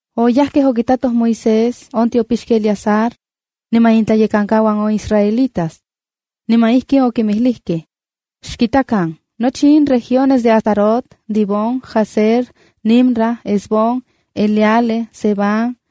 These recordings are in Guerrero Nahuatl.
oyajkej okitatoj Moisés, on tiopixki Eleazar, niman intlayekankauan on israelitas. Niman ijkin okinmijlijkej: —Xkitakan: nochi in regiones de Atarot, Dibón, Jazer, Nimra, Hesbón, Eleale, Sebam,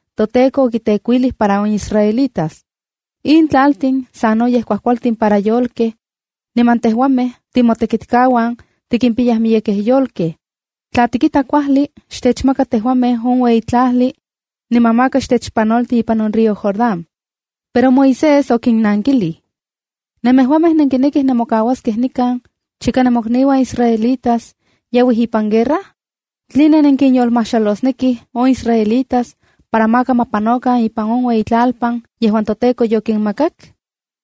toTEKO okitekuilij para on israelitas. In tlaltin sanoyej kuajkualtin para yolkej, niman tejuamej timotekitkauan tikimpiyaj miyekej yolkej. Tla tikita kuajli, xtechmaka tejuamej on ueyitlajli, niman maka xtechpanolti ipan on río Jordán. Pero Moisés okinnankilij: —¿Nemejuamej nenkinekij nemokauaskej nikan chika nemokniuan israelitas yauij ipan guerra? ¿Tline nenkinyolmajxalosnekij on israelitas para maka ma panokan ipan on ueyitlalpan yejuan toTEKO yokinmakak?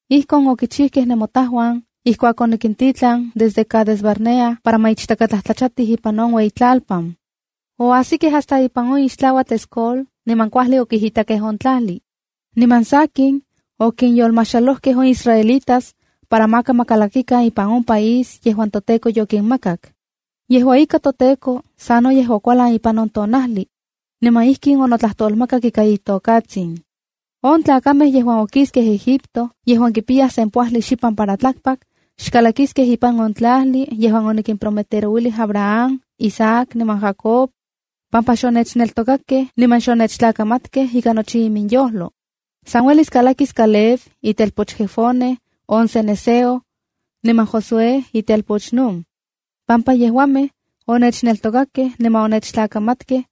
Ijkon okichijkej nemotajuan ijkuak onikintitlan desde Cades-barnea para ma ichtakatlajtlachatij ipan on ueyitlalpan. Oajsikej hasta ipan on ixtlauatl, Escol niman kuajli okijitakej on tlajli. Niman sakin, okinyolmajxalojkej on israelitas para maka ma kalakikan ipan on país yejuan toTEKO yokinmakak. Yejua ika, toTEKO sanoyej okualan ipan on tonajli, niman ijkin onotlajtolmakak ika itokatsin: “On tlakamej yejuan okiskej Egipto, yejuan kipiyaj sempoajli xipan para tlakpak, xkalakiskej ipan on tlajli yejuan onikprometerouilij Abraham, Isaac niman Jacob, pampa xonechneltokakej niman xonechtlamatkej ika nochi iminyojlo. San uelis kalakis Caleb itelpoch Jefone on cenezeo, niman Josué itelpoch Nun, pampa yejuamej onechneltokakej niman onechtlakamatkej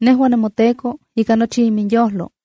iminTEKO ika nochi iminyojlo.”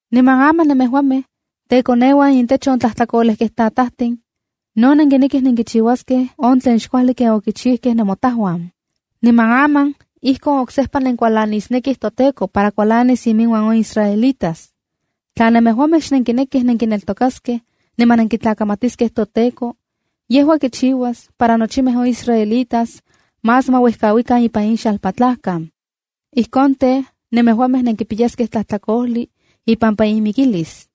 Niman aman nemejuamej, tekoneuan intech on tlajtlakolejkej tatajtin, no nenkinekij nenkichiuaskej on tlen xkuajli ken okichijkej nemotajuan. Niman aman ijkon oksejpa nenkualanisnekij toTEKO para kualanis iminuan on israelitas. Tla nemejuamej xnenkinekij nenkineltokaskej niman nenkitlakamatiskej toTEKO, yejua kichiuas para nochimej on israelitas más ma uejkauikan ipan in xalpatlajkan. Ijkon tej, nemejuamej nenkipiyaskej tlajtlakojli ipampa inmikilis.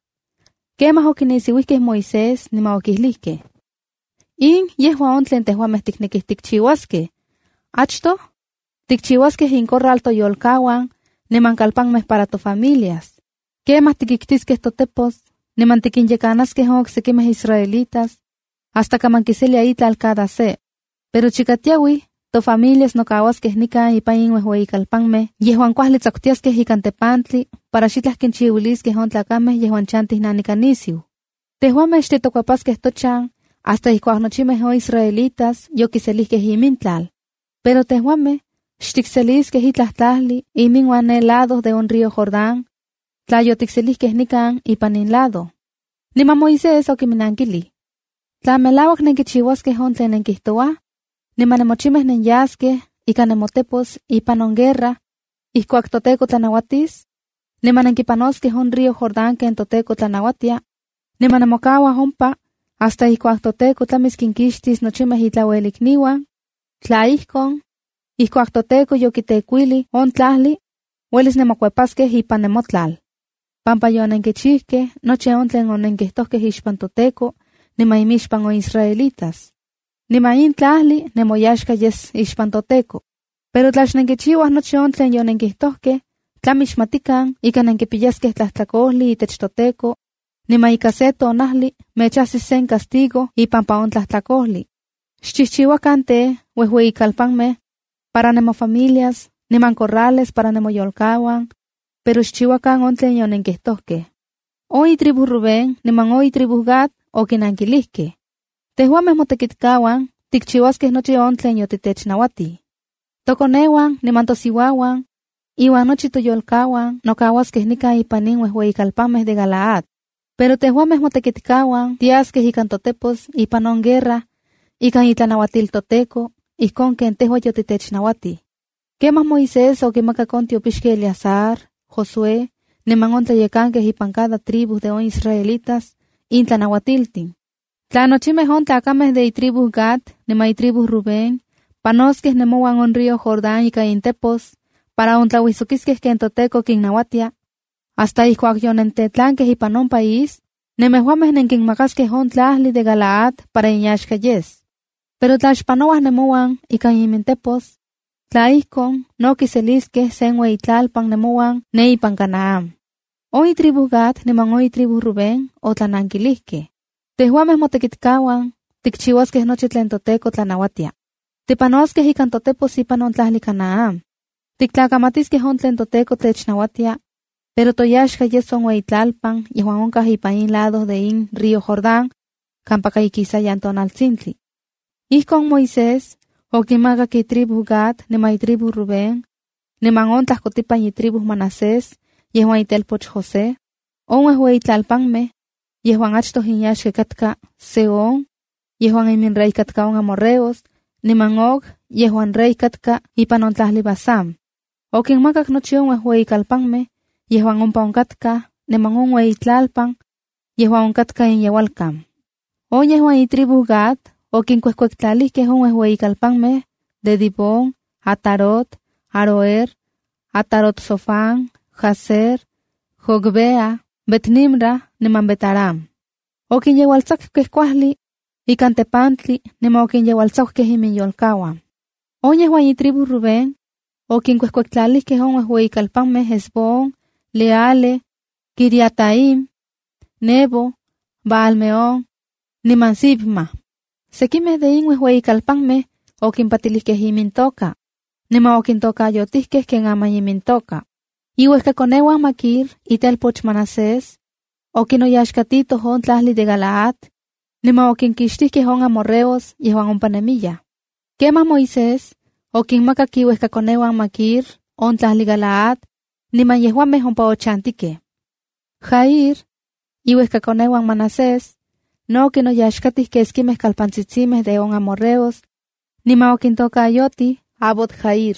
Kemaj okinisiuijkej Moisés niman okijlijkej: —In yejua on tlen tejuamej tiknekij tikchiuaskej: Achtoj tikchijchiuaskej incorral toyolkauan, niman kalpanmej para tofamilias. Kemaj tiktiskej totepos niman tikinyekanaskej on oksekimej israelitas hasta kaman kiselia itlal cada se. Pero chika tiauij, tofamilias nokauaskej nikan ipan in uejueyikalpanmej yejuan kuajli tsakutiaskej ikan tepantli para xitlaj kinchiuiliskej on tlakamej yejuan chantij nanika nisiu. Tejuamej xtitokuepaskej tochan hasta ijkuak nochimej on israelitas yokiselijkej imintlal. Pero tejuamej xtikseliskej itlaj tlajli iminuan ne lado de on río Jordán, tla yotikselijkej nikan ipan in lado. Niman Moisés okiminankilij: —Tla melauak nenkichiuaskej on tlen nenkijtouaj, niman nemochimej nenyaskej ikan nemotepos ipan on guerra ijkuak toTEKO tlanauatis, niman nenkipanoskej on río Jordán ken toTEKO tlanauatia, niman nemokauaj ompa hasta ijkuak toTEKO tlamis kinkixtis nochimej itlauelikniuan, tla ijkon, ijkuak toTEKO yokitekuilij on tlajli, uelis nenmokuepaskej ipan nemotlal, pampa yonenkichijkej nochi on tlen onenkijtojkej ixpan toTEKO, niman inmixpan on israelitas. Niman in tlajli nemoyaxka yes ixpan toTEKO. Pero tla xnenkichiuaj nochi on tlen yonenkijtojkej, tlami xmatikan ika nenkipiyaskej tlajtlakojli itech toTEKO, niman ika se tonajli mechajsis sen castigo ipampa on tlajtlakojli. Xkinchijchiuakan tej, uejueyikalpanmej para nemofamilias, niman corrales para nemoyolkauan, pero xchiuakan on tlen yonenkijtojkej. On itribu Rubén niman on itribu Gad okinankilijkej: —Tejuamej motekitkauan tikchiuaskej nochi on tlen yotitechnauatij. Tokoneuan niman tosiuauan, iuan nochi toyolkauan nokauaskej nikan ipan in uejueyikalpanmej de Galaad. Pero tejuamej motekitkauan tiaskej ikan totepos ipan on guerra ikan itlanauatil toTEKO, ijkon ken tejua yotitechnauatij. Kemaj Moisés okimakak on tiopixki Eleazar, Josué niman on tlayekankej ipan cada tribu de on israelitas in tlanauatiltin: —Tla nochimej on tlakamej de itribu Gad niman itribu Rubén panoskej nemouan on río Jordán ika intepos para ontlauijsokiskej ken toTEKO kinnauatia, hasta ijkuak yonentetlankej ipan on país, nemejuamej nenkinmakaskej on tlajli de Galaad para inyaxka yes. Pero tla xpanouaj nemouan ikan imintepos, tla ijkon, no kiseliskej sen ueyitlalpan nemouan ne ipan Canaán. On itribu Gad niman on itribu Rubén otlanankilijkej: —Tejuamej motekitkauan tikchiuaskej nochi tlen toTEKO tlanauatia. Tipanoskej ikan totepos ipan on tlajli Canaán. Tiktlakamatiskej on tlen toTEKO technauatia, pero toyaxka yes on ueyitlalpan yejuan onkaj ipan in lado de in río Jordán kampaka ikisayan tonaltsintli. Ijkon Moisés okinmakak itribu Gad niman itribu Rubén niman on tlajkotipan itribu Manasés yejuan itelpoch José, on uejueyi tlalpanmej yejuan achtoj inyaxka katka Sehón yejuan iminrey katka on amorreos, niman Og yejuan rey katka ipan on tlajli Basán. Okinmakak nochi on uejueyikalpanmej yejuan ompa onkatkaj niman on ueyitlalpan yejuan onkatka inyeualkan. On yejuan itribu Gad okinkuejkuektlalijkej on uejueyikalpanmej de Dibón, Atarot, Aroer, Atarot-sofan, Jazer, Jogbeha, Bet-nimra niman Bet-arán. Okinyeualtsakukej kuajli ikan tepantli niman okinyeualtsakukej iminyolkauan. On yejuan itribu Rubén okinkuejkuektlalijkej on uejueyikalpanmej Hesbón, Eleale, Quiriataim, Nebo, Baal-meón niman Sibma. Sekimej de in uejueyikalpanmej okimpatilijkej imintoka, niman okintokayotikej ken aman imintokaj. Iuejkakoneuan Maquir, itelpoch Manasés, okinoyaxkatitoj on tlajli de Galaad, niman okinkixtijkej on amorreos yejuan ompa nemiyaj. Kemaj Moisés okinmakak iuejkakoneuan Maquir on tlajli Galaad, niman yejuamej ompa onochantijkej. Jair, iuejkakoneu Manasés, no okinoyaxkatij keskimej kalpantsitsimej de on amorreos, niman okintokayotij Havot-jair.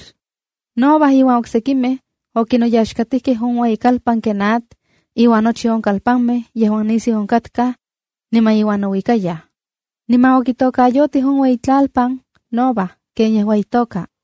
Noba iuan oksekimej okinoyaxkatijkej on ueyikalpan Kenat iuan nochi on kalpanmej yejuan nisiu onkatkaj niman iuan nouikayaj, niman okitokayotij on ueyitlalpan Noba ken yejua itoka.